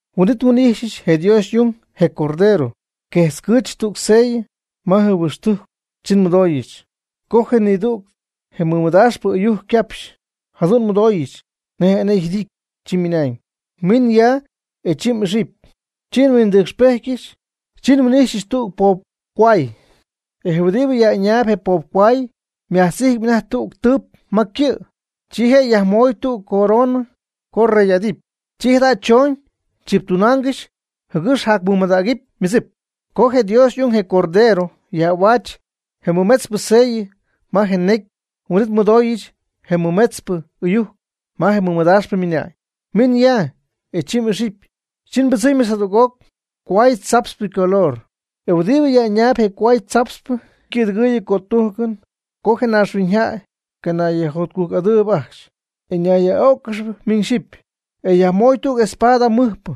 Huin'it nhuin'ijxyɨch je Dios y'ung, je Cordero, quejtzcɨɨch tüg sellɨ ma je huixtujcpɨ chi nmɨdooyɨch, co nidüg je mɨdaaxpɨ ɨyujc ycapxy, jadu'n nmɨdooyɨch nej enee yjɨdity, chi ymɨnañ: ―Min ya, e chi m'ixɨpy. Chi nhuindɨcxpejtyɨch, chi nhuin'ijxyɨch tüg poob cohuay. E je huɨdibɨ yaj'ɨñaayb je poob cohuay ymajtz'ijtpy anajty tüg tɨp ma ycɨ'. Chi je' yajmoy tüg coronɨ co yrey'adɨpy. Chi jada' choñ tziptunaangɨxy jɨgɨx jacmɨmadägɨpy ymɨdzip. Co je Dios y'ung, je Cordero, yaj'ahuaach je mɨmetzpɨ sellɨ ma je necy, huin'it nmɨdooyɨch je mɨmetzpɨ ɨyujc ma je mɨdaaxpɨ ymɨna'ñ: ―Min ya, e chi m'ixɨpy. Chi ypɨdzɨmy jadüg cohuay tzaptzpɨ ycolor. E huɨdibɨ yaj'ɨñaayb je cohuay chaptzpɨ, ycɨ̈dɨgɨɨyɨ cötujcɨn co je naaxhuiñyjäy canayyajjotcujc'adɨɨb ajcxy, e ñayyaj'öcɨgɨxɨpy miñ xyɨpy. E yajmooy tüg espada mɨjpɨ.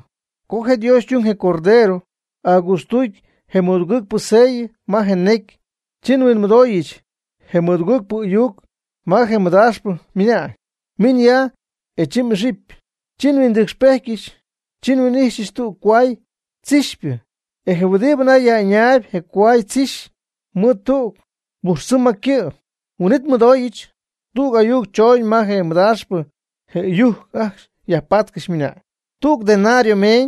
Co je Dios y'ung, je Cordero, agɨɨtztuudy je mɨdugɨɨgpɨ sellɨ ma je necy, chi nhuinmɨdooyɨch je mɨdugɨɨgpɨ ɨyujc ma je mɨdaaxpɨ, ymɨna'ñ: ―Min ya, e chi m'ixɨpy. Chi nhuindɨcxpejtyɨch, chi nhuin'ijxyɨch tüg cohuay tzixypɨ. E je huɨdibɨ anajty yaj'ɨñaayb je cohuaychixy, ymɨɨd tüg pujxtzɨm ma ycɨ'. Huin'it nhuinmɨdooyɨch tüg ayuc choñ ma je mɨdaaxpɨ je ɨyujc ajcxy yajpaatcɨxy, ymɨna'ñ: ―Tüg denario meeñ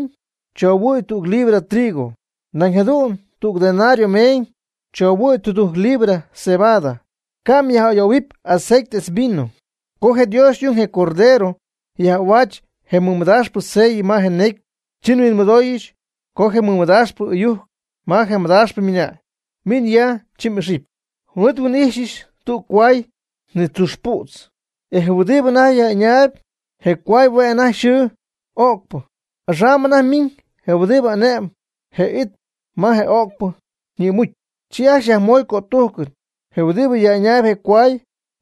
chohuɨ̈y tüg libra trigo; nañ jadu'n tüg denario meeñ chohuɨ̈y tudujc libra cebada, ca' myaj'ayoohuɨpy aceite etz vino. Co je Dios y'ung, je Cordero, yaj'ahuaach je mɨmadaaxpɨ sellɨ ma je necy, chi nhuinmɨdooyɨch co je mɨmadaaxpɨ ɨyujc ma je madaaxpɨ ymɨna'ñ: ―Min ya, chi m'ixɨpy. Huin'it nhuin'ijxyɨch tüg cohuay nitzuxy pu'tz, e je huɨdibɨ anajty yaj'ɨñaayb je cohuay, hue' anajty yxɨɨ öcpɨ. Axam anajty ymiiñ je huɨdibɨ ane'mb je it ma je öcpɨ ñïmucy. Chi ajcxy yajmoy cötujcɨn je huɨdibɨ yaj'ɨñaayb je cohuay,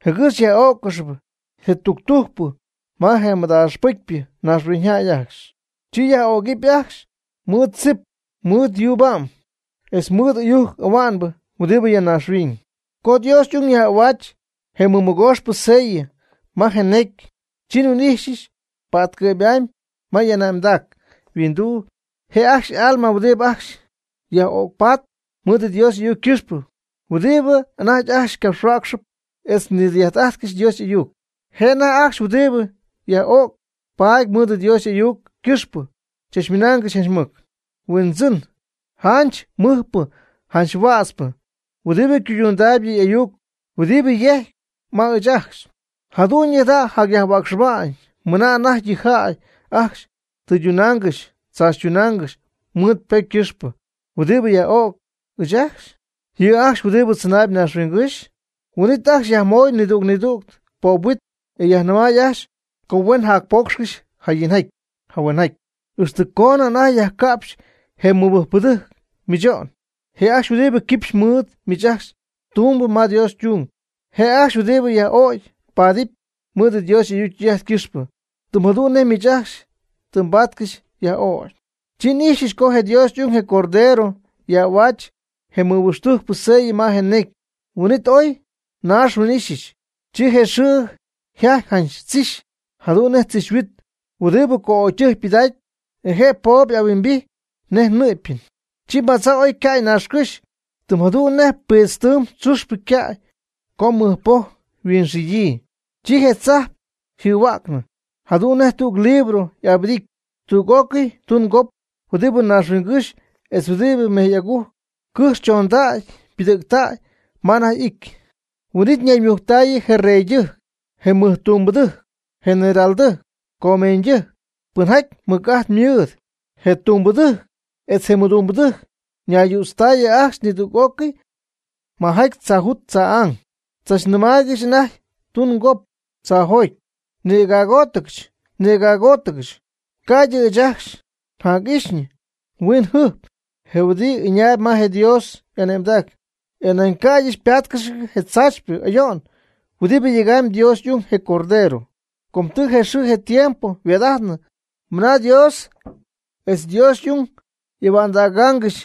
jɨgɨx yaj'ó'ccɨxɨpy je tügpɨcypɨ ma je madaaxpɨcypɨ naaxhuiñyjäy ajcxy. Chi yaj'ögɨp ajcxy mɨɨd tzip, mɨɨd yuuba'm, etz mɨɨd ɨyujc ahua'nbɨ huɨdibɨ ya naaxhuiñ. Co Dios y'ung yaj'ahuaach je mɨmɨgooxpɨ sellɨ ma je necy, chi nhuin'ijxyɨch pa'tcɨ'py'amy ma y'ane'mdac yhuinduu, je' ajcxy y'alma huɨdibɨ ajcxy yaj'öcpat mɨɨd Dios y'ayuc ycɨxpɨ, huɨdibɨ anajty ajcxy capxhuäcxcɨxp etz nidɨy'ajt'ajtcɨxp Dios y'ayuc. Je' anajty ajcxy huɨdibɨ yaj'ögy patp mɨɨd Dios y'ayuc ycɨxpɨ chachmɨnaangɨxy janch mɨc: ―Huindzɨn, janch mɨjpɨ janch huätzpɨ, huɨdibɨ cuydundaayb yɨ m'ayuc huɨdibɨ myejc ma ɨɨch ajcxy. ¿Jadu'ñyɨ jada' mjac-huäcxɨba'ñ mɨna anajty yɨ jäy ajcxy mdɨydunaangɨxy mdzaachytunaangɨxy mɨɨd ypocy ycɨxpɨ huɨdibɨ xyaj'o'c ɨɨch ajcxy, yɨ' ajcxy huɨdibɨ tzɨnaayb naaxhuiñygɨ́xy? Huin'it ajcxy yajmoy nidüg nidüg poobhuit, e yajnɨmay ajcxy co huen jacpoocxcɨxy jayinjaty jahuenjaty, ixtɨ coonɨ anajty yajca'pxy je mɨbɨjcpɨdɨjc mɨcho'n, je' ajcxy huɨdibɨ quipxy mɨɨd miich ajcxy tumb ma Dios ytung, je' ajcxy huɨdibɨ yaj'ögy paadɨpy mɨɨd Dios y'ayuc ytɨy'ajt ycɨxpɨ, tɨm jadu'n nej miich ajcxy tɨ mbaatcɨxy yaj'ögy. Chi n'ijxyɨch co je Dios y'ung, je Cordero, yaj'ahuaach je mɨdudujcpɨ sellɨ ma je necy, huin'it ooy naax yhuiñyxijty, chi je xɨɨ yjajty janch tzixy, jadu'n nej tzixyhuit huɨdibɨ co'ögytɨjc ypɨdacpy, e je po' y'ahuimbijty nej nɨ'pyɨn. Chi madza' ooy yca'y naaxcɨ́xy tɨm jadu'n nej piidztɨɨm tzuxpɨ ycäy co mɨcpoj mɨxidɨ̈y. Chi je tzajp yjɨhuäcnɨ jadu'n nej tüg libro'abɨdity. Tüg'ócɨy tungop huɨdibɨ naaxhuiñgɨ́xy etz huɨdibɨ mejy'agujc, cɨjx chondägy ypɨdɨ̈ctäy ma anajty y'ity. Huin'it ñayyütztaayɨ je reydɨjc, je mɨjtungmɨɨdpɨdɨjc, generaltɨjc, comeeñydɨjc, pɨnjaty ymɨc'ajt mɨɨd, je tumbɨdɨjc etz je mɨdumbɨdɨjc ñayyütztaayɨ ajcxy nidüg'ócɨy majaty tzaajut tzaa'ang. Tzachnɨmaaygɨxy anajty tungop tzaajot: ―Nïgägootcɨch nïgägootcɨch, ca'ydɨ ɨɨch ajcxy njac'ijxɨ yhuiñyjɨjp je huɨdibɨ ɨñaayb ma Dios y'ane'mdac, e nañ ca'ydɨ nbáatcɨxyɨch je tzaachypɨ ayo'n huɨdibɨ yegamyb Dios y'ung, je Cordero. Com tɨ je xɨɨ je tiempo yhuaad'ajtnɨ mɨna Dios etz Dios y'ung y'ahua'ndägaangɨxy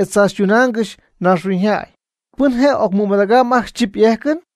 etz tzaachytunaangɨxy naaxhuiñyjäy. ¿Pɨn je' ocmɨmadägɨp ajcxy chip y'ejcɨn?